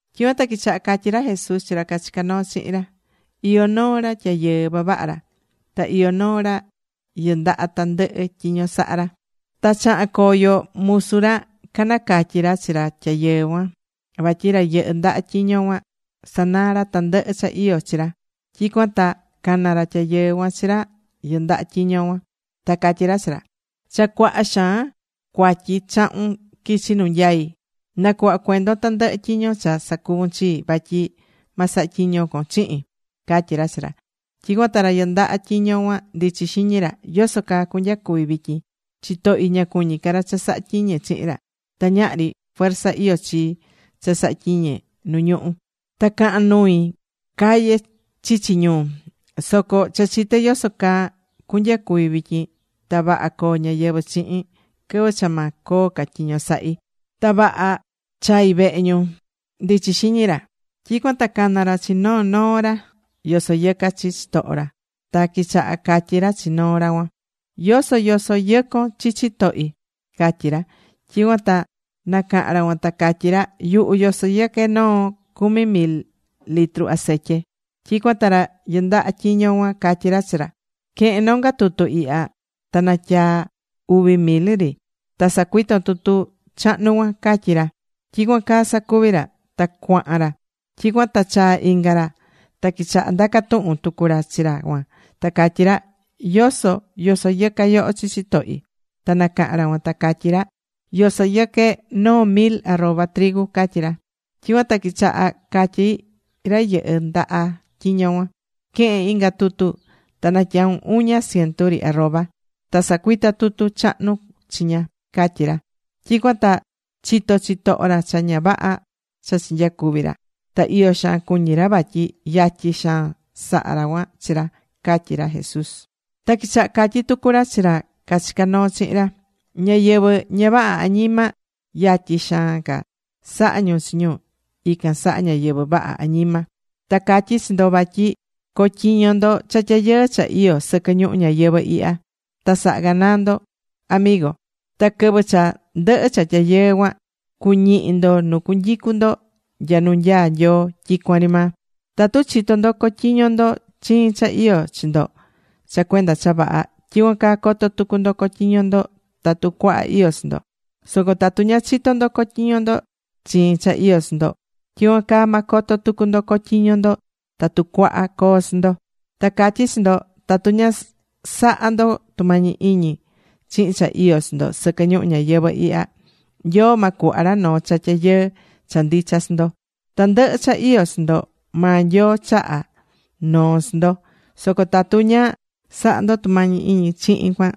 Tyicuan ta quichaha catyí ra Jesús chi ra cachicá noo chihin ra: ―Iyó noo ra tyayɨɨ vavaha ra. Ta iyó noo ra yɨndaha tandɨhɨ tyiño sahá ra. Ta chaha̱n coyo musu ra canacatyi ra chi ra tyayɨɨ cuan, vatyi ra yɨhɨ́ ndaha tyiño cuan, sanaa ra tandɨhɨ cha iyó chi ra. Tyicuan ta cana̱ ra tyayɨɨ cuan chi ra yɨndaha tyiño cuan, ta catyí ra chi ra: “Cha cuaha xaan cuatyi chahún quichi nu nyaí. Na̱cuhva cuendon tandɨhɨ tyiño cha sacuvu̱n chii. Vatyi ma saha tyiño con chihin”, catyí ra chi ra. Tyicuan ta ra yɨndaha tyiño cuan ndichi xiñi ra: “¿Yoso caa cunyacuvi vityin? Chitohi ña cuñí ca ra cha sahá tyiñe chihin ra. Ta ñahri fuerza iyó chii cha saha tyiñe nu ñuhú. Ta cahán nui caye chichi ñuu. Soco cha chité yoso caa cunyacuvi vityin, ta vaha coo ñáyɨvɨ chihin quɨvɨ cha ma coo ca tyiño sahi, ta vaha chai vehe ñu”, ndichi xiñi ra. Tyicuan ta cana̱ ra chi noo noo ra yosoyɨcá chi chitoho ra. Ta quichaha catyí ra chi noo ra cuan: “¿Yoso yosoyɨcón chi chitohi?” catyí ra. Tyicuan ta nacaha̱n ra cuan ta catyí ra: “Yuhu yosoyɨqué noo cumi mil litru aceitye.” Tyicuan ta ra yɨndaha tyiño cuan catyí ra chi ra: “Que̱hen nonga tutu ihya. Ta na̱tyaa uvi mil ri. Ta sa̱cuiton tutu chahnu cuan”, catyí ra. Tyicuan caa sacuvi̱ ra. Ta cuahan ra. Tyicuan ta chaa̱ inga ra. Ta quichaha ndaca tuhun tucu ra chi ra cuan ta catyí ra: “¿Yoso yosoyɨcá yoho chi chitohi?” Ta nacaha̱n ra cuan ta catyí ra: “Yosoyɨqué noo mil arroba”, catyí ra. Tyicuan ta quichaha catyí ra yɨndaha tyiño cuan: “Que̱hen inga tutu, ta na̱tyaun uña cientu ri arroba. Ta sa̱cuita tutu chahnu chiña”, catyí ra. Tyicuan ta chitó chitoho ra cha ña vaha cha chinyacuvi̱ ra. Ta iyo xaan cuñí ra vatyi yatyi xaan saha̱ ra cuan chi ra ―catyí ra Jesús. Ta quichaha catyi tucu ra chi ra cachicá noo chihin ra: ―Ñáyɨvɨ ña vaha añima yatyi xaan ca sahá ñu chi ñu ican saha ñáyɨvɨ vaha añima. ’Ta catyí chi ndo, vatyi co̱tyiño ndo cha tyayɨɨ cha iyó sɨquɨ ñuhu ñayɨvɨ̱ ihya, ta sa̱ha ganaa ndo amigo. Ta quɨvɨ cha ndɨhɨ cha tyayɨɨ cuan, cuñihi ndo nu cunyicu ndo nya nu nyaá Nyoo tyicuan ri maa. ’Tatu chitó ndo cotyiño ndo chiin cha iyó chi ndo cha cuenda cha vaha, tyicuan caa coto tucu ndo cotyiño ndo tatu cuaha iyó chi ndo. Soco tatu ña chitó ndo cotyiño ndo chiin cha iyó chi ndo, tyicuan caa ma coto tucu ndo cotyiño ndo tatu cuaha coo chi ndo. Ta catyí chi ndo, tatu ña sahá ndo tumañi iñi chihin cha iyó chi ndo sɨquɨ ñuhu ñayɨvɨ̱ ihya, Nyoo ma cuhva ra noo cha tyayɨɨ cha ndicha chi ndo. Tandɨhɨ cha iyó chi ndo maa Nyoo chaha̱ noo chi ndo. Soco tatu ña sahá ndo tumañi iñi chihin cuan,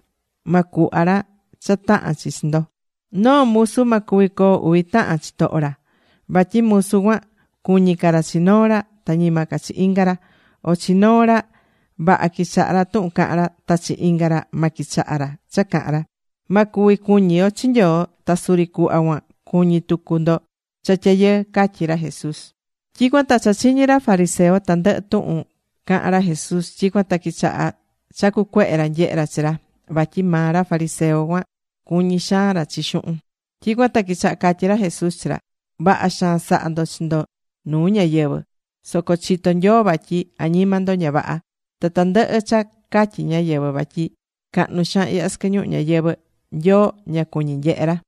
ma cuhva ra cha tahán chi chi ndo. ’Noo musu ma cuvi coo uvi tahan chitoho ra. Vatyi musu cuan cuñí ca ra chi noo ra, ta ñima ca chi inga ra. O chi noo ra, vaha quichahá ra tuhun cahán ra, ta chi inga ra, ma quichaha ra cha cahán ra. Ma cuvi cuñi ndo chi Nyoo ta suri cuhva cuan cuñi tucu ndo cha tyayɨɨ ―catyí ra Jesús. Tyicuan ta cha chiñi̱ ra fariseo tandɨhɨ tuhun cahán ra Jesús. Tyicuan ta quichaha chacu cuehe ra nyehe ra chi ra. Vatyi maa ra fariseo cuan cuñí xaan ra chi xuhun. Tyicuan ta quichaha catyí ra Jesús chi ra: ―Vaha xaan sahá ndo chi ndo nuu ñáyɨvɨ. Soco chitó Nyoo vatyi añima ndo ña vaha. Ta tandɨhɨ cha catyí ñáyɨvɨ vatyi cahnu xaan ihya sɨquɨ ñuhu ñayɨvɨ̱, Nyoo ña cuñí nyehe ra.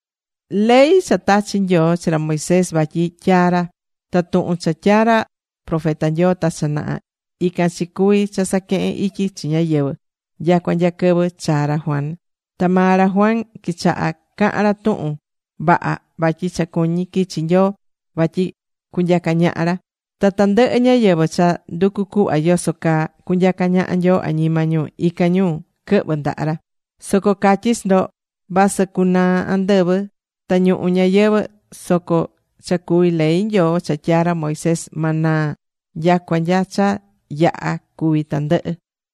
’Ley cha tachi̱ Nyoo chi ra Moisés vatyi tyaa ra, ta tuhun cha tyaa̱ ra profeta Nyoo ta cha naha, ican chi cuvi cha saquehe̱n ityi chi ñáyɨvɨ nyacua nya quɨvɨ chaa̱ ra Juan. Ta maa ra Juan quichaha cahan ra tuhun vaha vatyi cha cuñí quichi Nyoo vatyi cunyaca ñaha ra. Ta tandɨhɨ ñáyɨvɨ cha nducú cuhva yoso caa cunyaca ñaha Nyoo añima ñu, ican ñu quɨhvɨ ndaha ra. ’Soco catyí chi ndo, vasɨ cunaa andɨvɨ ta ñuhu ñayɨvɨ̱, soco cha cuví ley Nyoo cha tyaa̱ ra Moisés, ma naa nyacua nya cha yaha̱ cuvi tandɨhɨ.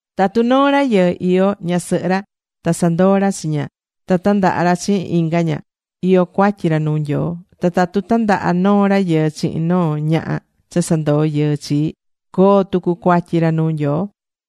’Tatu noo rayɨɨ iyó ñasɨhɨ ra, ta sanandoo ra chi ña, ta tandaha ra chihin inga ña, iyó cuatyi ra nuu Nyoo. Ta tatu tandaha noo rayɨɨ chihin noo ñaha cha sandoo yɨɨ chii, coo tucu cuatyi ra nuu Nyoo.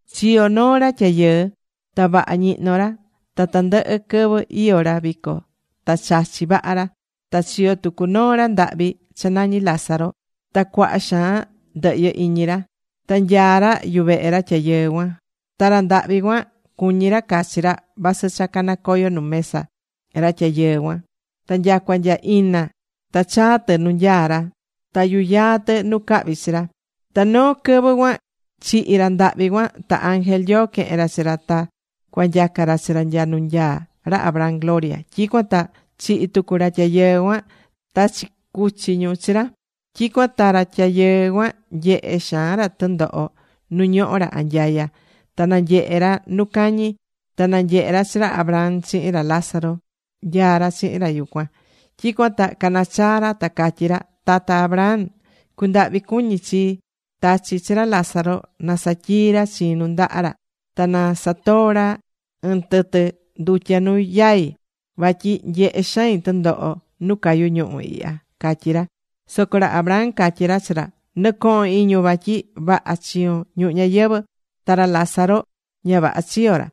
’Chiyo̱ noo ra tyayɨɨ. Ta vaha ñihnó ra. Ta tandɨhɨ quɨvɨ iyó ra vico ta chachí vaha ra. Ta chiyo̱ tucu noo ra ndahvi cha nañí Lázaro. Ta cuaha xaan ndɨhyɨ iñi ra. Ta nyaá ra yuvehe ra tyayɨɨ cuan. Ta ra ndahvi cuan, cuñí ra cachi ra, vasɨ cha canacoyo nu mesa ra tyayɨɨ cuan. Ta nyacua nya ina ta chaa̱ tɨ nu nyaá ra, ta yuyaá tɨ nu cahvi chi ra. Ta noo quɨvɨ cuan chihi̱ ra ndahvi cuan. Ta ángel Nyoo quehe̱n ra chi ra ta cua nyaca ra chi ra nya nu nyaá ra Abraham gloria. Tyicuan ta chihi̱ tucu ra tyayɨɨ cuan. Ta chicuchi̱ ñu chi ra. Tyicuan ta ra tyayɨɨ cuan nyehé xaan ra tundoho nu ñohó ra anyaya. Ta nanyehe̱ ra nu cañi. Ta nanyehe̱ ra chi ra Abraham chihin ra Lázaro, nyaá ra chihin ra yucuan. Tyicuan ta canachaa̱ ra ta catyí ra: “Tata Abraham, cu̱ndahvi cuñi chii. Ta̱chi chi ra Lázaro na satyii ra chiin nundaha ra. Ta na satoo ra ɨɨn tɨtɨ ndutya nu yai. Vatyi nyehé xain tundoho nu cayú ñuhu̱ ihya”, catyí ra. Soco ra Abraham catyí ra chi ra: “Nɨ̱cohon iñun vatyi vaha chiyo̱n ñuhu ñayɨvɨ̱. Ta ra Lázaro, ña vaha chiyo̱ ra.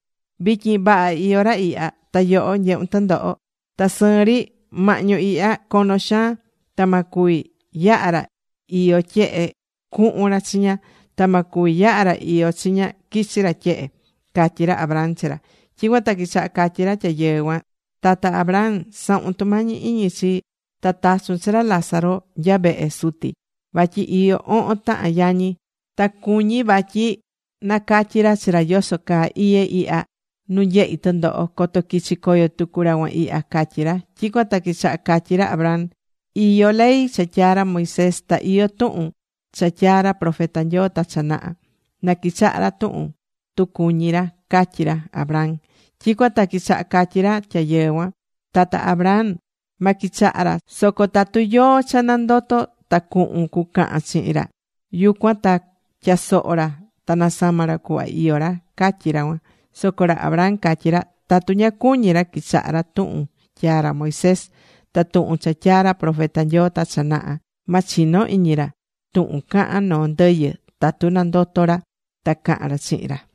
Vityin vaha iyó ra ihya, ta yoho nyehún tundoho. Ta sɨɨn ri, mahñu ihya cono xaan. Ta ma cuvi yaha ra iyó tyehe cuhun ra chiña. Ta ma cuvi yaha ra iyó chiña, quichi ra tyehe”, catyí ra Abraham chi ra. Tyicuan ta quichaha catyí ra tyayɨɨ cuan: “Tata Abraham, sa̱hun tumañi iñi chii. Ta ta̱chun chi ra Lázaro nya vehe suti. Vatyi iyó ohon tahan yañi. Ta cuñí vatyi nacatyi ra chi ra yoso caa iyé ihya nu nyehí tundoho, coto quichi coyo tucu ra cuan ihya”, catyí ra. Tyicuan ta quichaha catyí ra Abraham: “Iyó ley cha tyaa̱ ra Moisés. Ta iyó tuhun cha tyaa̱ ra profeta Nyoo ta cha naha. Na quichaha ra tu cuñí ra”, catyí ra Abraham. Tyicuan ta quichaha catyí ra tyayɨɨ cuan: “Tata Abraham. Ma quichaha ra. Soco tatu yóó cha nandoto, ta cuhun cucahan chihin ra, yucuan ta tyasoho ra ta nasama ra cuhva iyó ra”, catyí ra cuan. Soco ra Abraham catyí ra: “Tatu ña cuñí ra quichaha ra tuhun tyaa̱ ra Moisés ta tuhun cha tyaa̱ ra profeta Nyoo ta cha naha, ma chino iñi ra tuhun cahan noo ndɨyɨ tatu nandoto ra ta cahan ra chihin ra.”